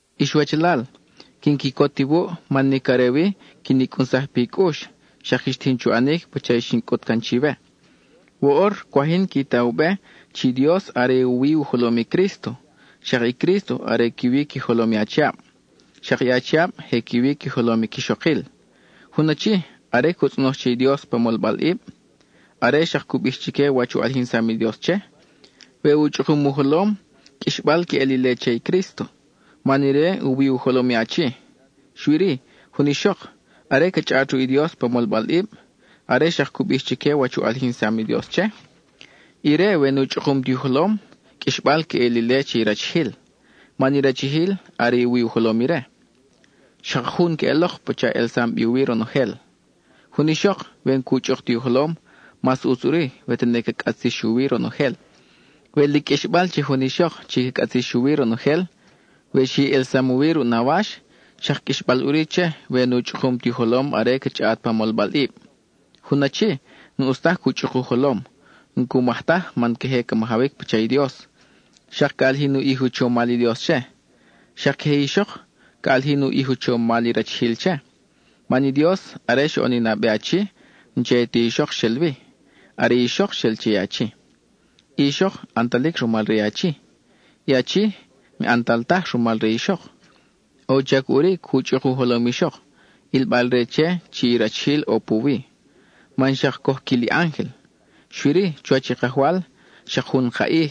Ix wachalal, quin quicot iwuʼ man nic are wi quin i cʼunsaj pi cʼux, xak quix tijin chu ʼanic pacha i xin cʼut can chiwe. Woʼor cwaj yin qui ta u be chi i Dios are u wi u jolom i Crísto; xak i Crísto are qui wi qui jolom i achiab; xak i achiab je qui wi qui jolom i quixokil. Jun achi, are cu tzʼonoj che i Dios pa molbalʼib, are xak cu bij chique wach u ʼalijinsam i Dios che, we u chʼukum u jolom, qʼuixbal queʼel ile che i Crísto, man ire u wi u jolom i achi. Xui-ri, jun ixok, are ca chʼaʼat ruʼ i Dios pa molbalʼib, are xak cu bij chique wach u ʼalijinsam i Dios che, ire we nu chʼukum ti u jolom, qʼuixbal queʼel ile che i rachijil, man i rachijil are u wi u jolom ire. Xak jun queʼelok pacha elsam bi u wi ronojel. Jun ixok, we n-cu chʼuk ti u jolom, mas ʼutz ʼuri we tene ca cʼatzix u wi ronojel. We lic qʼuixbal che jun ixok chi ca cʼatzix u wi ronojel, we xi ʼelsam u wi ruʼ nawax, xak qʼuixbal ʼuri che we nu chʼukum ti u jolom are ca chʼaʼat pa molbalʼib. Jun achi, n-ʼus taj cu chʼuk u jolom; n-cu maj taj man queje ca majawic pacha i Dios, xak ca ʼalijin u ʼij u chomal i Dios che. Xak queje i ixok, ca ʼalijin u ʼij u chomal i rachijil che. Man i Dios are xoʼon i nabe achi, n-che ti ixok xel wi, are i ixok xel che achi. I ixok ʼantalic rumal re achi; i achi n-ʼantal taj rumal re ixok. ʼO u chac ʼuri cu chʼuk u jolom i ixok, ʼilbal-re che chi i rachijil ʼo puwi, man xak coj quil i ángel. Xui-ri, chuwach i Kajwal, xak jun ka ʼij,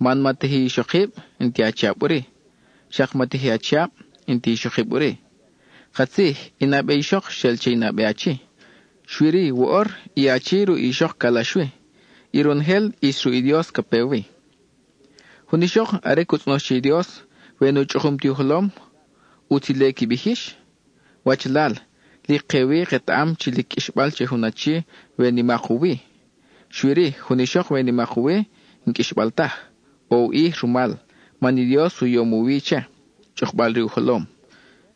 man ma teji ixokib, n-ti achiab ʼuri; xak ma teji achiab, n-ti ixokib ʼuri. Katzij, i nabe ixok xel che i nabe achi; xui-ri, woʼor, i achi ruʼ ixok calax wi; y ronojel ʼis ruʼ i Dios ca pe wi. Jun ixok, are cu tzʼonoj che i Dios, we nu chʼukum ti u jolom, ¿ʼutz ile qui bij yix? Wachalal, lic ke-wi ketaʼam chi lic qʼuixbal che jun achi we nimak u wi. Xui-ri, jun ixok we nimak u wi, n-qʼuixbal taj, ʼo u ʼij rumal, man i Dios u yom u wi che, chʼukbal-re u jolom.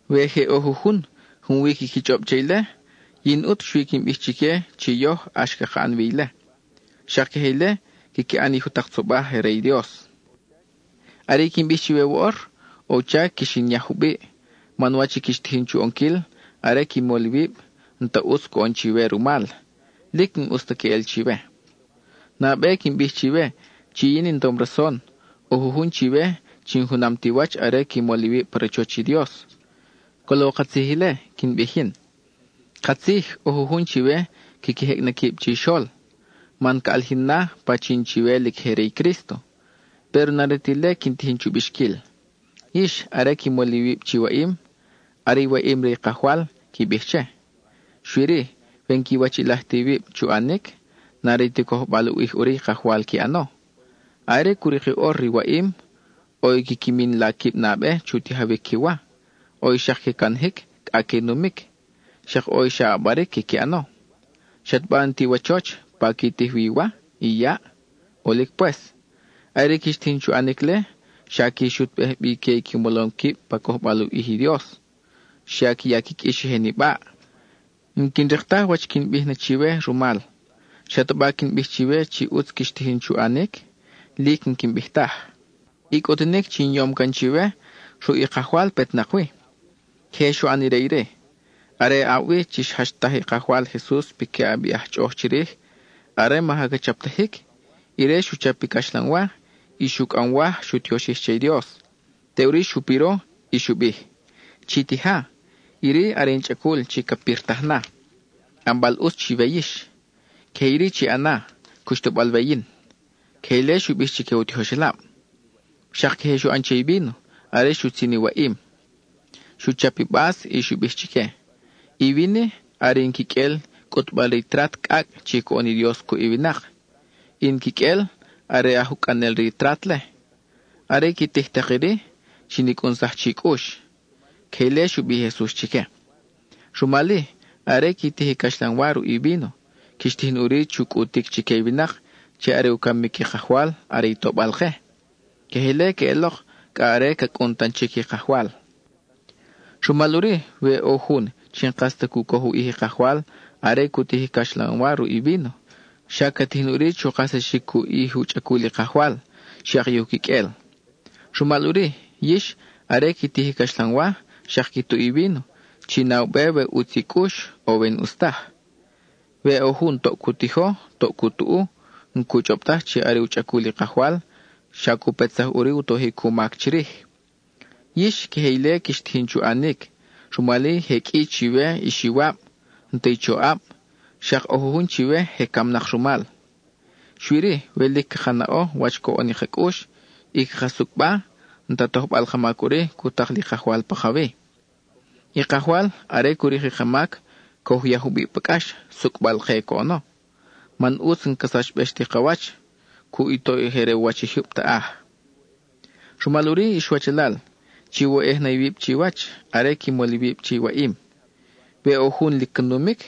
We je ʼo jujun, junwi quiqui chʼob che ile, yin ʼut xui quin bij chique chi yoj ʼax caka ʼan wi ile; xak queje ile quiqui ʼan i jutak tzobaj re i Dios. Are i quin bij chiwe woʼor, ʼo u chac quix in yaj jubiʼ, man wach i quix tijin chu ʼonquil are qui mol iwib, n-ta ʼutz coʼon chiwe rumal; lic n-ʼus ta queʼel chiwe. Nabe quin bij chiwe chi yin in tom rason, ʼo jujun chiwe chi n-junam ti wach are qui mol iwib pa rachoch i Dios; colo katzij ile quin bij yin. Katzij ʼo jujun chiwe quiqui jecʼ na quib chixol, man ca ʼalijin na pachin chiwe lic je re i Crísto, péro n-are ta ile quin tijin chu bixquil. Yix, are qui mol iwib chi waʼim, “Are i waʼim re i Kajwal,” qui bij che. Xui-ri, we n-quiwachiʼilaj ta iwib chu ʼanic, n-are ti cojbal u ʼij ʼuri i Kajwal qui ʼano. Are cu rik i ʼor re i waʼim, ʼo i quiqui min la quib nabe chu tijawic qui wa, ʼo i xak que canajic cʼa que numic, xak ʼo i xa ʼabaric quiqui ʼano. ¿Xataba n-ti iwachoch, pa qui tij wi i wa, i yaʼ? ʼOlic pues. Are i quix tijin chu ʼanic-le, xa qui xutbej bi que i qui molom quib pa cojbal u ʼij i Dios. Xa qui ya qui qʼuix i je nibaʼ. N-quin rik taj wach quin bij na chiwe rumal. ¿Xataba quin bij chiwe chi ʼutz quix tijin chu ʼanic? Lic n-quin bij taj. I cʼutunic chi in yom can chiwe, ruʼ i Kajwal petnak wi. Queje xu ʼan ire iri: are aʼab wi chi xjachtaj i Kajwal Jesus piquiʼab i aj chʼoʼoj chirij, are maja ca chaptajic, ire xu chap i caxlanwa, y xu cʼamwaj, xu tioxij che i Dios; teʼuri xu piro, y xu bij: “Chi tija; iri are in chʼacul chi ca pirtaj na, ʼanbal ʼutz chiwe yix. Queje iri chi ʼana, cuxtabal we yin.” (Queje ile xu bij chique u tijoxelab.) Xak queje xu ʼan che i víno are xutzin i waʼim; xu chap i bas y xu bij chique: “I vin-i, are in quiqʼuel cʼutbal re i trat cʼacʼ chi coʼon i Dios cuʼ i winak; i in quiqʼuel, are aj ucʼanel re i trat-le. Are qui tij tak iri, chin i cʼunsaj chi cʼux.” (Queje ile xu bij i Jesus chique.) Rumal-i, are qui tij i caxlanwa ruʼ i víno, quix tijin ʼuri chu cʼutic chique i winak chi are u camic i Kajwal are i tobal-ke. Queje ile queʼelok cʼa are ca cʼun tan chic i Kajwal. Rumal ʼuri, we ʼo jun chi n-kas ta cu coj u ʼij i Kajwal are cu tij i caxlanwa ruʼ i víno, xa ca tijin ʼuri chu kajsaxic u ʼij i u chʼacul i Kajwal, xak i u quiqʼuel. Rumal ʼuri, yix, are qui tij i caxlanwa, xak qui tuʼ i víno, chi na u be we ʼutz i cʼux, o we n-ʼus taj. We ʼo jun toʼ cu tijo, toʼ cu tuʼu, n-cu chʼob taj chi are u chʼacul i Kajwal, xa cu petsaj ʼuri u tojic u mac chirij. Yix, queje ile quix tijin chu ʼanic, rumal-i je qʼui chiwe ix iwab, n-ta i choʼab, xak ʼo jujun chiwe je camnak rumal. Xui-ri, we lic caka naʼo wach coʼon i ka cʼux, y caka sucʼba, n-ta tojbal ka mac ʼuri cu tak li Kajwal pakawi. I Kajwal, are cu rik i ka mac, coj u ya jubiʼ pa cʼax, sucʼbal-ke coʼono, man ʼutz n-ca sachbex ti ka wach cuʼ i toʼ je re u wach i jyub taʼaj. Rumal ʼuri, ix wachalal, chiwoyʼej na iwib chiwach, are qui mol iwib che i waʼim. We ʼo jun lic ca numic,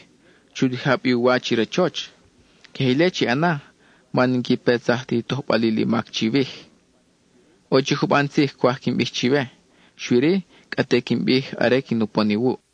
chu tija bi u wa chi rachoch; queje ile chi ʼana, man n-qui petsaj ti u tojbalil i mac chiwij. ʼO chic juban tzij cwaj quin bij chiwe, xui-ri, cʼa te quin bij are quin upon iwuʼ.